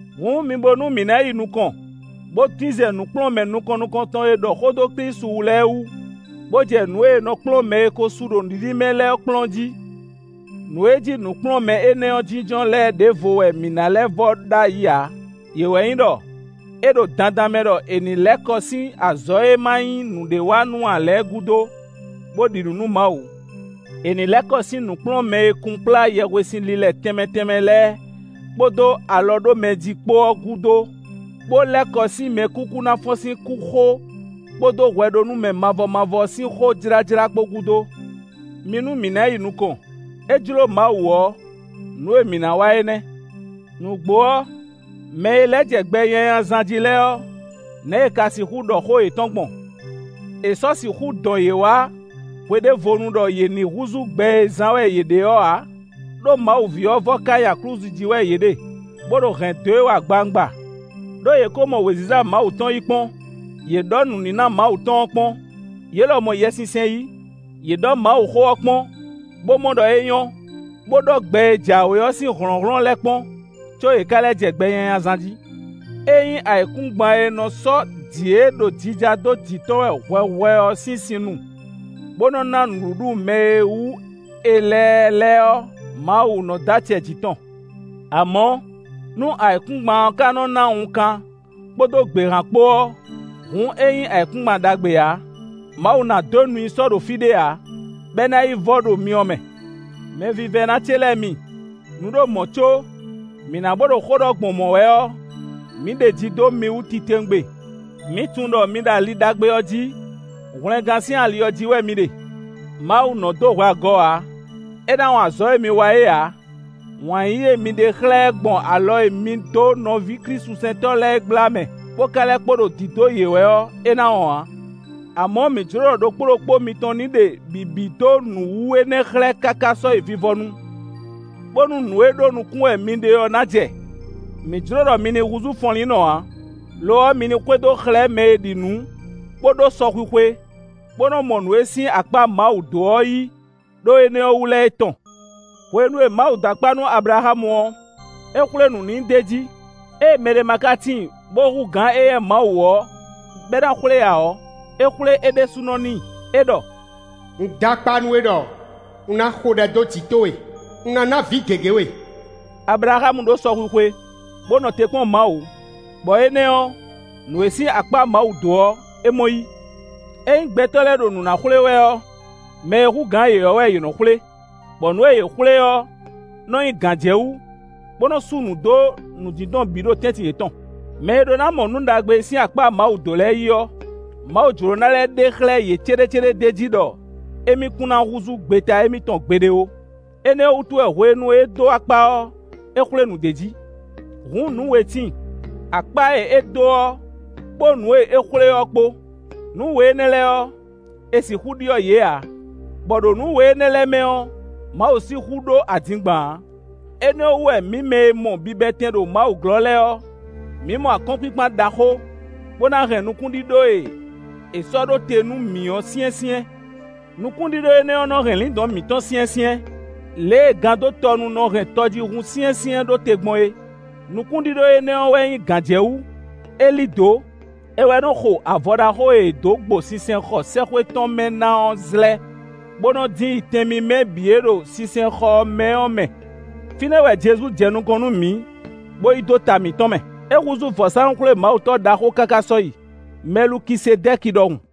Hǔn, mi bo nú mǐ ná yi nukɔn, bó dín zɛ nǔkplɔ́nmɛ nukɔn nukɔntɔn e ɖɔ xó dó Klísu wú lɛ́ɛ wú, bó jɛ nǔ e è nɔ kplɔ́n mɛ e ko su ɖo nǔɖiɖi mɛ lɛ́ɛ ɔ́ kplɔ́n jí. Nǔ e jí nǔkplɔ́nmɛ énɛ́ ɔ́ jínjɔ́n lɛ́ɛ ɖěvo wɛ mǐ ná lɛ́ vɔ ɖ'ayǐ ǎ; yě wɛ nyí ɖɔ: é ɖo dandan mɛ ɖɔ è nǐ lɛ́ kɔ sín azɔ̌ e ma nyí nǔɖé wa nú ǎ lɛ́ɛ gúdo, bó ɖi nǔ nú Mawu; è nǐ lɛ́ kɔ sín nǔkplɔ́nmɛ e kunkplá yɛhwesin lilɛ tɛnmɛ tɛnmɛ lɛ́ɛ kpódó alɔ ɖó mɛ jí kpó ɔ́ gúdo, bó lɛ́ kɔ sín mɛkúkú ná fɔ́n sín kú xó kpódó hwɛɖónúmɛ mavɔ mavɔ sín xó jlájlá kpó gúdo. Mi nú mǐ ná yi nukɔn; é jló Mawu ɔ́, nǔ e mǐ ná wa é nɛ́. Nǔgbó ɔ́, mɛ e lɛ́ jɛ gbɛ nyanya zán jí lɛ́ɛ ɔ́, nɛ̌ è ka sixú ɖɔ xó yětɔn gbɔn? È sɔ́ sixú dɔn yě wá hweɖévonu ɖɔ yě ní húzú gbɛ e zán wɛ yě ɖe ɔ́ ǎ, ɖó Mawu ví ɔ́ vɔ́ ká nyi aklúzu jí wɛ yě ɖe, bó ɖo hɛ̌n dó e wɛ agbawungba; ɖó yě ko mɔ wěziza Mawu tɔn yí kpɔ́n; yě ɖɔ̌ nǔníná Mawu tɔn ɔ́ kpɔ́n; yě lɔ mɔ Yɛsinsɛn yí. Yě ɖɔ̌ Mawuxó ɔ́ kpɔ́n, bó mɔ ɖɔ é nyɔ́, bó ɖɔ́ gbɛ e jǎwe ɔ́ sín hlɔ̌nhlɔ́n lɛ́ɛ kpɔ́n, có yě ka lɛ́ jɛ gbɛ nyanya zán jí. Ényí ayǐkúngban e nɔ sɔ́ jǐ e ɖo jija dó jǐ tɔn wɛ hwɛhwɛ ɔ́ sín sin nu, bó nɔ́ ná nǔɖuɖu mɛ e wú è lɛ ɛ lɛ́ɛ ɔ́, Mawu nɔ dó acɛ jǐ tɔn. Amɔ̌, nú ayǐkúngban ɔ́ ka nɔ ná wunkan kpódó gběhan kpó ɔ́, hǔn é nyí ayǐkúngban ɖagbe ǎ; Mawu ná dó nu i sɔ́ ɖo fí ɖé ǎ, bɔ é ná yi vɔ ɖo myɔ mɛ. Mɛvívɛ́ná ce lɛ́ɛ mi, nǔ ɖo mɔ̌ có mǐ ná bó ɖo xó ɖɔ gbɔn mɔ̌ wɛ ɔ́, mǐ ɖeji dó mi wú titewungbe; mǐ tunwun ɖɔ mi ɖo ali ɖagbe ɔ́ jí; hwlɛngán sín ali ɔ́ jí wɛ mi ɖe. Mawu nɔ dó hwɛ agɔ ǎ; é ná wɔn azɔ̌ e mi wa é ǎ; wǎn yíyí e mi ɖe xlɛ́ ɛ gbɔn alɔ e mi dó nɔví klísusɛntɔ́ lɛ́ɛ é gbla mɛ, bó ka lɛ́ kpo ɖo dǐdó yě wɛ ɔ́, é ná wɔn ǎ. Amɔ̌ mǐ jló ɖɔ ɖokpó ɖokpó mitɔn ní ɖe bǐbí dó nǔ wú énɛ́ xlɛ́ káká sɔ́yi vivɔnu, bónú nǔ e ɖó nukún wɛ mi ɖe ɔ́ ná jɛ. Mǐ jló ɖɔ mi ní húzú fɔnlínnɔ ǎ, lo ɔ́, mi ní xwedó xlɛ́ mɛ e ɖi nǔ bó ɖó sɔxwixwe, bó nɔ mɔ nǔ e sín akpá Mawu dó ɔ́ yí, ɖó énɛ́ wú lɛ́ɛ é tɔn. Hwenu e Mawu dó akpá nú Ablaxámu ɔ́, é xwlé nǔ n'i d'é jí. Ée mɛɖé ma ka tíin, bó hú gǎn éyɛ́ Mawu ɔ́, bɔ é ná xwlé ǎ ɔ́, é xwlé é ɖésúnɔ n'i. É ɖɔ: “Un d'akpá nú we ɖɔ: un ná xo ɖɛ dó jǐ towe; un ná ná vǐ gěgé we.” Ablaxámu ɖó sɔxwixwe, bó nɔ te kpɔ́n Mawu, bɔ énɛ́ ɔ́, nǔ e sín akpá Mawu dó ɔ́, é mɔ yí. Ényí gbɛtɔ́ lɛ́ɛ ɖo nǔ ná xwlé wɛ ɔ́, mɛ e hú gǎn yě ɔ́ wɛ yě nɔ xwlé, bɔ nǔ e yě xwlé ɔ́ nɔ nyí gǎnjɛwú, bó nɔ sú nǔ dó nǔdindɔn bǐ ɖo tɛ́ntin yětɔn. Mɛ e ɖó ná mɔ nǔ ɖagbe e sín akpá Mawu dó lɛ́ɛ yí ɔ́, Mawu jló ná lɛ́ ɖe xlɛ́ yě céɖécéɖé d'é jí ɖɔ émí kún ná húzú gbeta émítɔn gbeɖé ó. Énɛ́ ɔ́ wútu wɛ hwenu e é dó akpá ɔ́, é xwlé nǔ d'é jí. Hǔn, nǔ we tíin: akpá e é dó ɔ́ kpó nǔ e é xwlé ɔ́ kpó; nǔ we énɛ́ lɛ́ɛ ɔ́, è sixú ɖyɔ́ yě ǎ, bɔ ɖo nǔ we énɛ́ lɛ́ɛ mɛ ɔ́, Mawu sixú ɖó adingban ǎ. Énɛ́ ɔ́ wú wɛ mǐ mɛ e mɔ bibɛtɛn ɖo Mawu glɔ́ lɛ́ɛ ɔ́, mǐ mɔ akɔ́nkpinkpan ɖaxó, bó ná hɛn nukúnɖíɖó e è sɔ́ ɖó te nú mǐ ɔ́ syɛ́nsyɛ́n. Nukúnɖíɖó énɛ́ ɔ́ nɔ hɛn lǐndɔ̌n mǐtɔn syɛ́nsyɛ́n, lě e gandótɔnu nɔ hɛn tɔjíhún syɛ́nsyɛ́n ɖó te gbɔn é. Nukúnɖíɖó énɛ́ ɔ́ wɛ nyí gǎnjɛwú; é lí dǒ; é wɛ nɔ xo avɔ ɖaxó e è dǒ gbo sinsɛnxɔ sɛ́xwé tɔn mɛ ná ɔ́ zlɛ́ bó nɔ dín yi tɛn mímɛ́ bǐ e ɖo sinsɛnxɔ ɔ́ mɛ ɔ́ mɛ. Fínɛ́ wɛ Jezu jɛ nukɔn nú mǐ, bó yi dó ta mǐtɔn mɛ. É húzú vɔ̌sánú-xwlémawutɔ́ ɖaxó káká sɔ́yi, Mɛlukisedɛ́ki ɖɔhun.